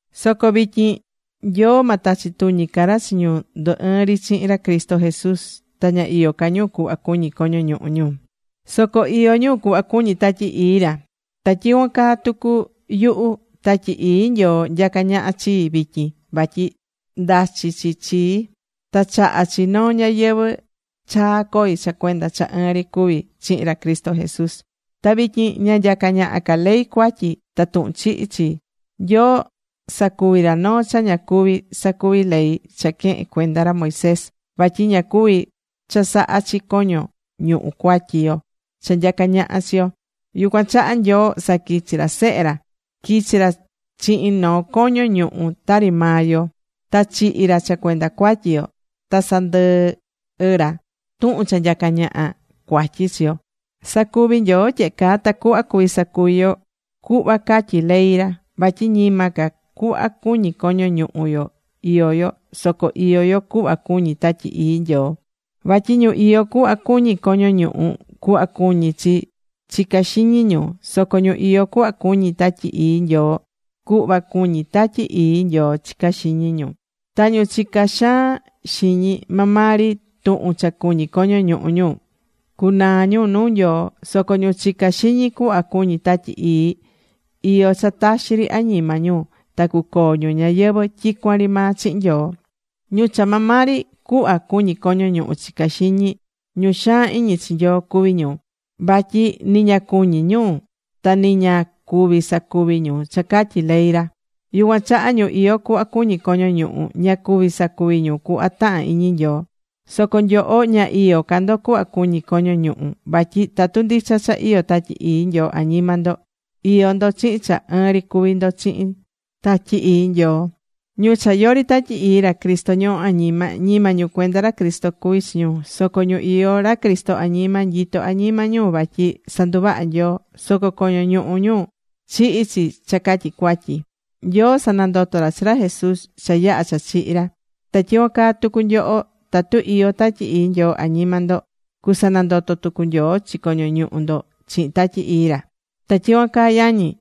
Soco vityin, Nyoo ma tachi tuñi ca ra chi ñu ndu̱ ɨɨn ri chihin ra Cristo Jesús, ta ña iyó ca ñu cuhva cuñí coño ñuhu ñu, soco iyó ñu cuhva cuñí Tatyi Ii ra. Ta tyicuan caa tucu yuhu, Tatyi Ii Nyoo nyacá ñaha chii vityin vatyi ndachi̱ chi chii, ta chahá chi noo ñayɨvɨ̱ chaa coi cha cuenda cha ɨɨn ri cuví chihin ra Cristo Jesús. Ta vityin ña nyacá ñaha ca ley cuatyi ta tuhun chihi chii. Nyoo sacuvi̱ ra noo cha ña cuví sacuvi ley cha quehe̱n cuenda ra Moisés, vatyi ña cuvi̱ chasaha chi coño ñuhu cuatyi yo cha nyacá ñaha chi yo. Yucuan chaha Nyoo saquichi̱ ra chi Sehe ra. Quichi̱ ra chihin noo coño ñuhu tari maa yo, ta chihi̱ ra cha cuenda cuatyi yo, ta sandɨhɨ̱ ra tuhun cha nyacá ñaha cuatyi chi yo. Sacuvi̱ Nyoo tyehe caa tacuhva cuvi sacuvi yo cuhva catyí ley ra, vatyi ñima ca cuhva cuñí coño ñuhu yo iyó yo, soco iyó yo cuhva cuñí Tatyi Ii Nyoo. Vatyi ñu iyó cuhva cuñí coño ñuhu, cuhva cuñí chi chicá xiñi ñu, soco ñu iyó cuhva cuñí Tatyi Ii Nyoo, cuhva cuñí Tatyi Ii Nyoo chicá xiñi ñu. Ta ñu chicá xaan xiñi maa maa ri tuhun cha cuñí coño ñuhu ñu, cunaa ñu nuu Nyoo. Soco ñu chicá xiñi cuhva cuñí Tatyi Ii. Iyó cha taxi ri añima ñu ta cucoo ñu ñayɨvɨ̱ tyicuan ri maa chihin Nyoo. Ñu cha maa maa ri cuhva cuñí coño ñuhu chicá xiñi, ñu xaan iñi chi Nyoo cuví ñu, vatyi ni ña cuñí ñu ta ni ña cuví sacuvi ñu cha catyí ley ra. Yucuan chaha ñu iyó cuhva cuñí coño ñuhu, ña cuví sacuvi ñu cuhva tahán iñi Nyoo. Soco nyoho ña iyó ca ndo cuhva cuñí coño ñuhu, vatyi tatu ndicha cha iyó Tatyi Ii Nyoo añima ndo, iyó ndo chihin cha ɨɨn ri cuví ndo chihin Tatyi Ii Nyoo. Ñu cha yori Tatyi Ii ra Cristo ñohó añima, ñima ñu cuenda ra Cristo cuví chi ñu. Soco ñu iyó ra Cristo añima, nyitó añima ñu vatyi sanduvaha̱ Nyoo. Soco coño ñuhu ñu chihi̱ chi cha catyi cuatyi. Nyoo sanandoto̱ ra chi ra Jesús cha yaha̱ cha chihi̱ ra. Ta tyicuan caa tucu nyoho, tatu iyó Tatyi Ii Nyoo añima ndo, cusanandoto tucu Nyoo chi coño ñuhu ndo chihin Tatyi Ii ra. Ta tyicuan caa yañi,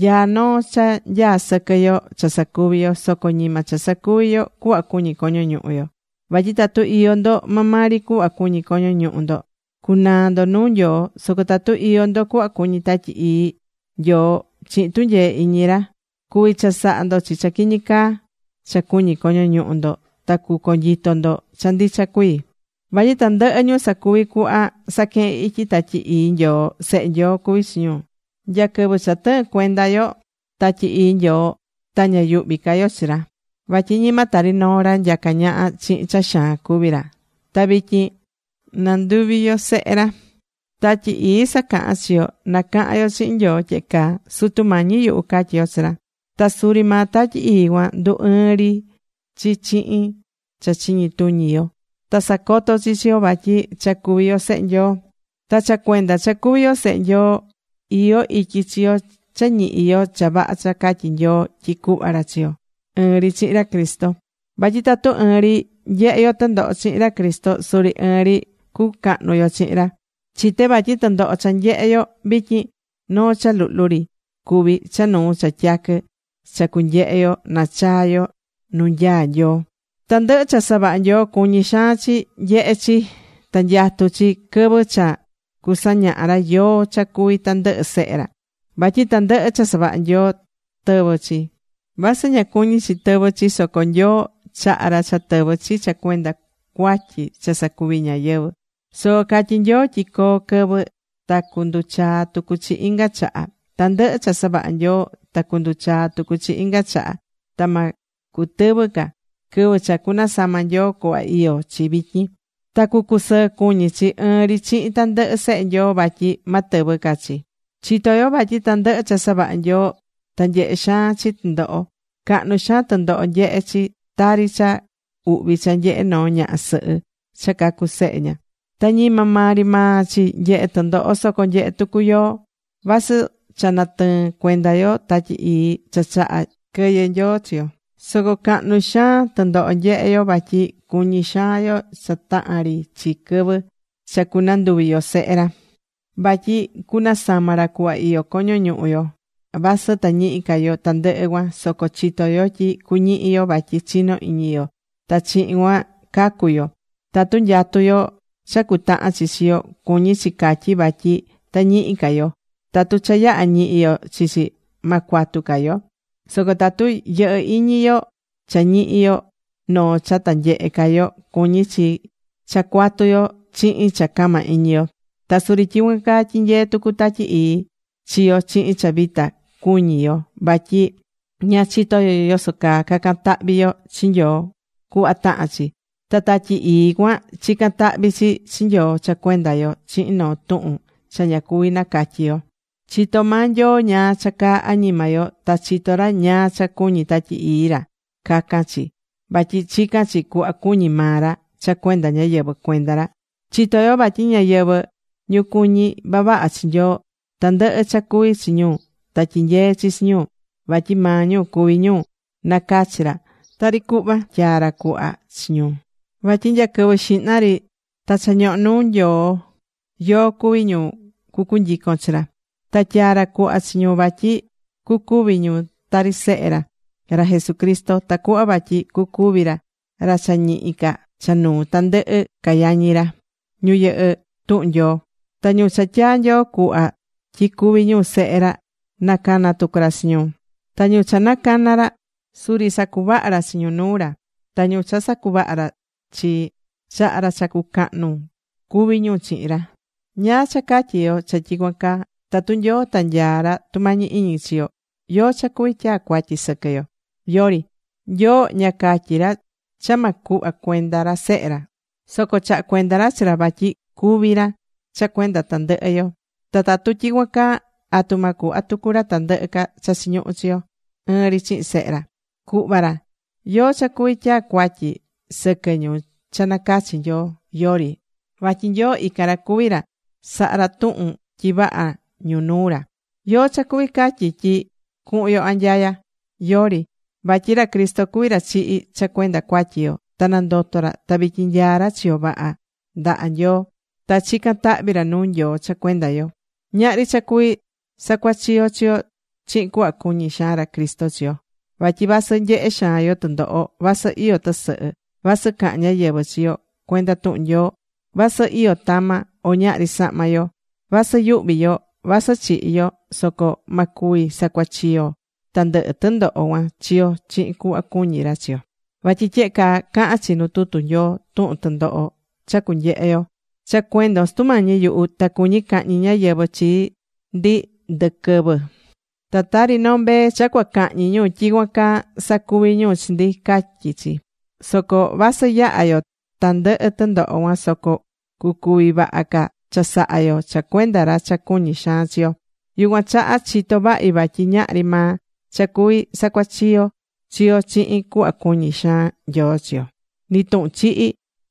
nyaá noo cha nyaá sɨquɨ yo cha sacuvi yo, soco ñima cha sacuvi yo cuhva cuñí coño ñuhu yo. Vatyi tatu iyó ndo maa maa ri cuhva cuñí coño ñuhu ndo, cunaa ndo nuu Nyoo. Soco tatu iyó ndo cuhva cuñí Tatyi Ii Nyoo chihin tunyee iñi ra, cuví chasaha ndo chi cha quiñi caa cha cuñí coño ñuhu ndo ta cuconyito ndo cha ndicha cuii. Vatyi tandɨhɨ ñu sacuví cuhva saquehén ityi Tatyi Ii Nyoo, sehe Nyoo cuví chi ñu. Nya quɨvɨ cha tɨɨ̱n cuenda yo Tatyi Ii Nyoo ta ña yuhví ca yo chi ra, vatyi ñima tari noo ra nyacá ñaha chihin cha xaan cuví ra, ta vityin nanduvi̱ yo sehe ra. Tatyi Ii sacahán chi yo na cahan yo chihin Nyoo tyehe caa: “Sutu Mañi yuhu”, catyí yo chi ra. Ta suri maa Tatyi Ii cuan ndu̱ ɨɨn ri chi chihin cha chiñi tuñi yo ta sacoto chi chi yo vatyi cha cuví yo sehe Nyoo. Ta cha cuenda cha cuví yo sehe ra, iyó ityi chi yo cha ñihi yo cha vaha cha catyí Nyoo tyi cuhva ra chi yo, ɨɨn ri chihin ra Cristo. Vatyi tatu ɨɨn ri nyehé yo tɨndoho chihin ra Cristo, suri ɨɨn ri cucahnu yo chihin ra. Chité vatyi tɨndoho cha nyehé yo vityin, noo cha luhlu ri cuví cha nuu cha tyaquɨ cha cunyehe yo nachaa yo nuu nyaá Nyoo. Tandɨhɨ cha savaha̱ Nyoo cuñí xaan chi nyehe chi, ta nyatú chi quɨvɨ cha cusañaha ra yóó cha cuví tandɨhɨ sehe ra. Vatyi tandɨhɨ cha savaha̱ Nyoo tɨvɨ̱ chi. Vasɨ ña cuñi̱ chi tɨvɨ chi soco Nyoo chaha̱ ra cha tɨvɨ̱ chi cha cuenda cuatyi cha sacuvi̱ ñáyɨvɨ. Soco catyi̱ Nyoo tyi coo quɨvɨ ta cunduchaa tucu chi inga chaha. Tandɨhɨ cha savaha̱ Nyoo ta cunduchaa tucu chi inga chaha, ta ma cutɨvɨ ca, quɨvɨ cha cunasama Nyoo cuhva iyó chi vityin. Ta cucusɨɨ cuñí chi ɨɨn ri chihin tandɨhɨ sehe Nyoo vatyi ma tɨvɨ ca chi. Chitó yo vatyi tandɨhɨ cha savaha̱ Nyoo ta nyehé xaan chi tɨndoho. Cahnu xaan tɨndoho nyehé chi tari cha uhvi cha nyehé noo ñaha sɨhɨ cha cacú sehe ña. Ta ñima maa ri maa chi nyehé tɨndoho, soco nyehé tucu yoó. Vasɨ cha natɨɨ̱n cuenda yo Tatyi Ii cha chaha̱ quɨyɨ Nyoo chi yo, soco cahnu xaan tɨndoho nyehé yo, vatyi cuñí xaan yo cha tahán ri chi quɨvɨ cha cunanduvi yo sehe ra. Vatyi cunasama ra cuhva iyó coño ñuhu yo. Vasɨ ta ñihi ca yo tandɨhɨ cuan soco chitó yo tyi cuñihi yo vatyi chino iñi yo ta chihin cuan cacu yo. Tatu nyatú yo cha cutahan chi chi yo, cuñí chi catyi vatyi ta ñihi ca yo. Tatu cha yaha̱ ñihi yo chi chi, ma cuatu ca yo. Soco tatu yɨhɨ́ iñi yo cha ñihi yo noo cha ta nyehe ca yo, cuñí chi cha cuatu yo chihin cha cama iñi yo. Ta suri tyicuan caa tyinyeé tucu Tatyi Ii chi yo chihin cha vita cuñí yo vatyi ña chitó yo yoso caa cacan tahvi yo chi Nyoo cuhva tahán chi. Ta Tatyi Ii cuan chicán tahvi chi chi Nyoo cha cuenda yo chihin noo tuhun cha ña cuví nacatyi yo. Chitó maa Nyoo ñáá cha caá añima yo, ta chitó ra ñáá cha cuñí Tatyi Ii ra cacan chi, vatyi chicán chi cuhva cuñí maa ra cha cuenda ñáyɨvɨ cuenda ra. Chitó yo vatyi ñáyɨvɨ, ñu cuñí vavaha chi Nyoo, tandɨhɨ cha cuví chi ñu ta tyinyeé chi chi ñu, vatyi maa ñu cuví ñu nacachi̱ ra, tari cuhva tyaa̱ ra cuhva chi ñu. Vatyi nya quɨvɨ xihna ri, ta cha ñohó nuu Nyoo yóó cuví ñu cucunyicon chi ra. Ta tyaa̱ ra cuhva chi ñu vatyi cucuvi ñu tari Sehe ra, ra Jesucristo, tacuhva vatyi cucuvi ra ra cha ñihi ca cha nuu tandɨhɨ ca yañi ra, ñu yɨhɨ́ tuhun Nyoo. Ta ñu cha tyaa̱ Nyoo cuhva tyi cuvi ñu sehe ra, nacana̱ tucu ra chi ñu. Ta ñu cha nacana̱ ra, suri sacuvaha̱ ra chi ñu nuu ra. Ta ñu cha sacuvaha ra chi, chaha̱ ra cha cucahnu cuvi ñu chihin ra. ¿Ñáá cha catyi yo cha tyicuan caa? Tatu Nyoo ta nyaá ra tumañi iñi chi yo, ¿yóó cha cuví tyaa cuatyi sɨquɨ yo? Yori. Nyoo ña catyi̱ ra cha ma cuhva cuenda ra sehe ra, soco chaha̱ cuenda ra chi ra vatyi cúvi ra cha cuenda tandɨhɨ yo. Ta tatu tyicuan caa, ¿atu ma cuhva tucu ra tandɨhɨ ca cha chiñuhú chi yo ɨɨn ri chihin Sehe ra? Cuhva ra. ¿Yóó cha cuví tyaa cuatyi sɨquɨ ñu cha nacachi̱ Nyoo? Yori. Vatyi Nyoo ican ra cuví ra saha̱ ra tuhun tyi vaha ñu nuu ra. ¿Yóó cha cuví catyi tyi cuhun yo anyaya? Yori. Vatyi ra Cristo cuví ra chihi̱ cha cuenda cuatyi yo, ta nandoto̱ ra ta vityin nyaá ra chiyo vaha ndaha Nyoo, ta chicán tahvi ra nuu Nyoo cha cuenda yo. Ñahri cha cuví sacuachiyo chi yo chihin cuhva cuñí xaan ra Cristo chi yo. Vatyi vasɨ nyehé xaan yo tɨndoho, vasɨ iyó tɨsɨhɨ, vasɨ cahán ñáyɨvɨ chi yo cuenda tuhun Nyoo, vasɨ iyó tama, o ñahri sahma yo, vasɨ yuhví yo, vasɨ chihi yo, soco ma cuvi sacuachiyo tandɨhɨ tɨndoho cuan chi yo chihin cuhva cuñí ra chi yo. Vatyi tyehe caa cahán chi nu tutu Nyoo tuhun tɨndoho cha cunyehe yo: Cha cuendon, Sutu Mañi yuhu, ta cuñí cahñi ñáyɨvɨ chi ndi tandɨhɨ quɨvɨ. Ta tari noo mbee cha cua cahñi ñu, tyicuan caa sacuví ñu chi ndi, catyí chi. Soco vasɨ yahá yo tandɨhɨ tɨndoho cuan, soco cucuvi vaha ca chasaha yo cha cuenda ra cha cuñí xaan chi yo. Yucuan chaha chitó vahi vatyi ñahri maa cha cuví sacuachiyo chi yo chihin cuhva cuñí xaan Nyoo chi yo. Ni tuhun chihi,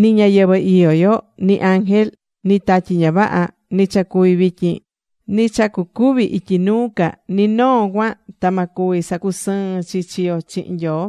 ni ñayɨvɨ̱ iyó yo, ni ángel, ni tatyi ña vaha, ni cha cuví vityin, ni cha cucuvi ityi nuu ca, ni noo cuan, ta ma cuvi sacusɨɨn chi chi yo chihin Nyoo.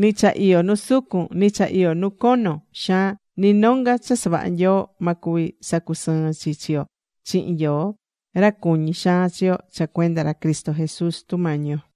Ni cha iyó nu sucun, ni cha iyó nu cono xaan, ni nonga cha savaha̱ Nyoo, ma cuvi sacusɨɨn chi chi yo chihin Nyoo, ra cuñí xaan chi yo cha cuenda ra Cristo Jesús Sutu Mañi yo.